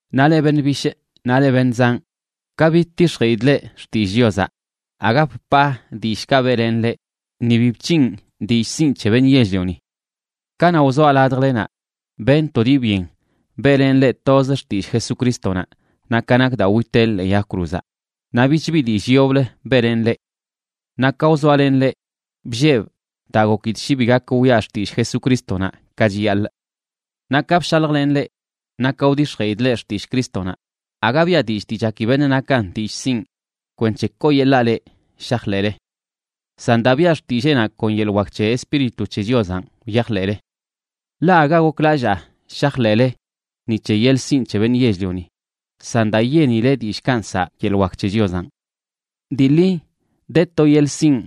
Naꞌ leꞌ beṉꞌ bishꞌ naꞌ leꞌ beṉꞌ zanꞌ, ka bidtix̱jeꞌidꞌ leꞌ xtillꞌ Chiozaꞌ, aga bpaa dillꞌkaꞌ beꞌlenꞌ leꞌ, ni bi bc̱hinꞌ dillꞌ sinꞌ c̱he beṉꞌ yell-lioni. Kanaꞌ wzoa ladjlenaꞌ, benꞌ to dii byen beꞌlenꞌ leꞌ toz xtillꞌ Jesucrístonaꞌ naꞌ ka nak daa witeꞌ ḻee yag cruzaꞌ, naꞌ bich bi dillꞌ yoblə beꞌlenꞌ leꞌ. Naꞌ ka wzoalenꞌ leꞌ, bllebꞌ daa gokidꞌ shi bi gakꞌ wiꞌa xtillꞌ Jesucrístonaꞌ ka chiyaḻꞌ. Naꞌ ka bshaljlenꞌ leꞌ naꞌ ka wdix̱jeꞌidꞌ leꞌ xtillꞌ Crístonaꞌ, aga biꞌa dillꞌ dii chaki beṉꞌ nakan dillꞌ sinꞌ kwenc̱he kooyeḻaa leꞌ shajḻeꞌle. San daa biꞌa xtilleenaꞌ kon yeḻꞌ wak c̱he Espíritu c̱he Chiozanꞌ wyajḻeꞌle. Ḻaꞌ aga goklallaa shajḻeꞌle ni c̱he yeḻꞌ sinꞌ c̱he beṉꞌ yell-lioni, san daa yenileꞌ dillꞌkaꞌ nsaꞌ yeḻꞌ wak c̱he Chiozanꞌ. Dii ḻi de to yeḻꞌ sinꞌ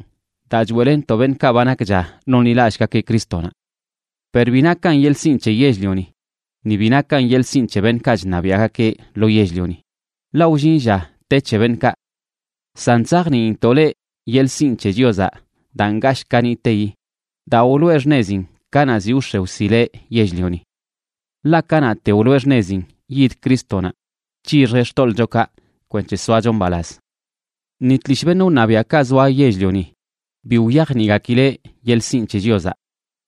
daa choeꞌlenntoꞌ beṉꞌkaꞌ ba nakcha nonḻilallꞌgakeꞌ Crístonaꞌ. Per bi nakan yeḻꞌ sinꞌ c̱he yell-lioni, ni bi nakan yeḻꞌ sinꞌ c̱he beṉꞌkaꞌ chṉabiaꞌgakeꞌ lo yell-lioni, ḻaꞌ wllin lla te c̱he beṉꞌkaꞌ. San chzajniintoꞌ leꞌ yeḻꞌ sinꞌ c̱he Chiozaꞌ daa ngashꞌ kaniꞌteyi, daa wloꞌe xṉezin kanaꞌ ziꞌ wx̱e wsileꞌ yell-lioni. Ḻaꞌ kanaꞌte wloꞌe xṉezin yid Crístonaꞌ c̱hixjeꞌ xtoḻꞌchokaꞌ kwenc̱he soacho mbalaz. Ni tlishꞌ beṉꞌ wṉabiaꞌkaꞌ zoa yell-lioni bi wyajniꞌgakileꞌ yeḻꞌ sinꞌ c̱he Chiozaꞌ,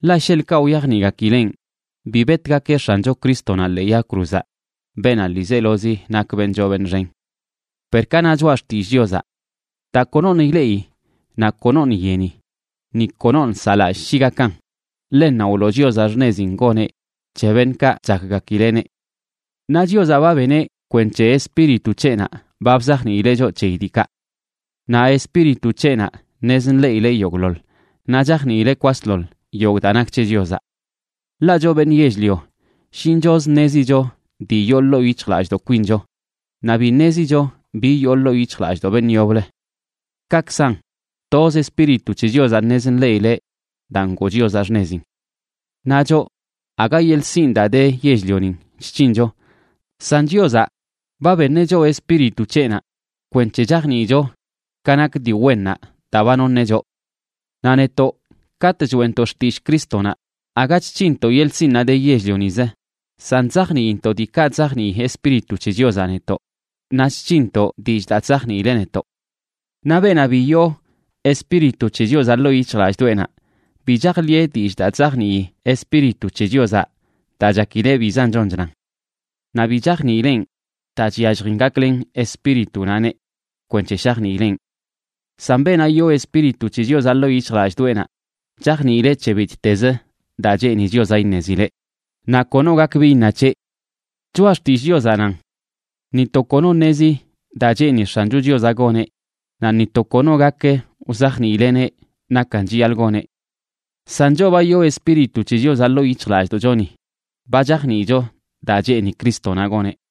ḻaꞌ sheḻꞌkaꞌ wyajniꞌgakileꞌn, bi betgakeꞌ X̱ancho Crístonaꞌ ḻee yag cruzaꞌ, beenaꞌ ḻiizelozi nak beṉꞌ choo beṉꞌ xen. Per ka na choꞌa xtillꞌ Chiozaꞌ: Daa konoṉꞌ ileꞌi naꞌ konoṉꞌ yeni, ni konoṉꞌ saꞌlallꞌ shi gakan, ḻennanꞌ wloo Chiozaꞌ xṉezin goneꞌ c̱he beṉꞌkaꞌ chakgakileꞌneꞌ. Naꞌ Chiozaꞌ ba beneꞌ kwenc̱he Espíritu c̱heꞌnaꞌ ba bzajniileꞌ choꞌ c̱heyi diikaꞌ. Naꞌ Espíritu c̱heꞌnaꞌ ṉez nḻeꞌileꞌ yogꞌḻoḻ, naꞌ chajniileꞌ kwasḻoḻ yogꞌ daa nak c̱he Chiozaꞌ. Ḻaꞌ choꞌ beṉꞌ yell-lio shinchozə ṉezicho dii yoo ḻoo yic̱hjlallꞌdoꞌ kwincho, naꞌ bi ṉezicho bi yoo ḻoo yic̱hjlallꞌdoꞌ beṉꞌ yoblə. Kaꞌkzan, toz Espíritu c̱he Chiozaꞌ ṉez nḻeꞌileꞌ daa ngoo Chiozaꞌ xṉezin. Naꞌ choꞌ aga yeḻꞌ sinꞌ daa de yell-lionin chc̱hincho, san Chiozaꞌ ba beṉeꞌ choꞌ Espíritu c̱heꞌnaꞌ kwenc̱he chajniicho ka nak dii wennaꞌ daa ba noṉeꞌ choꞌ. Naꞌ netoꞌ, katꞌ choeꞌntoꞌ xtillꞌ Crístonaꞌ, aga chc̱hinntoꞌ yeḻꞌ sinꞌnaꞌ de yell-lionizə, san chzajniintoꞌ diikaꞌ chzajnii Espíritu c̱he Chiozaꞌ netoꞌ, naꞌ chc̱hinntoꞌ dillꞌ daa chzajniileꞌ netoꞌ. Naꞌ beenaꞌ bi yoo Espíritu c̱he Chiozaꞌ ḻoo yic̱hjlallꞌdoꞌenaꞌ, bi chajḻiꞌe dillꞌ daa chzajnii Espíritu c̱he Chiozaꞌ, daa chakileꞌ bizan chon chnan. Naꞌ bi chajniileꞌn daa chyalljin gaklen Espíritunaꞌneꞌ kwenc̱he shajniileꞌn. San beenaꞌ yoo Espíritu c̱he Chiozaꞌ ḻoo yic̱hjlallꞌdoꞌenaꞌ chajniileꞌ c̱he bittezə daa cheeni Chiozaꞌ iṉezileꞌ, naꞌ kono gak bi iṉa c̱heꞌ. Choꞌa Xtillꞌ Chiozaꞌ nan: “Ni to kono ṉezi daa cheeni X̱ancho Chiozaꞌ goneꞌ, naꞌ ni to kono gak wzajniileꞌneꞌ nakan chiyaḻꞌ goneꞌ.” San choꞌ ba yoo Espíritu c̱he Chiozaꞌ ḻoo yic̱hjlallꞌdoꞌchoni, ba chajniicho daa cheeni Crístonaꞌ goneꞌ.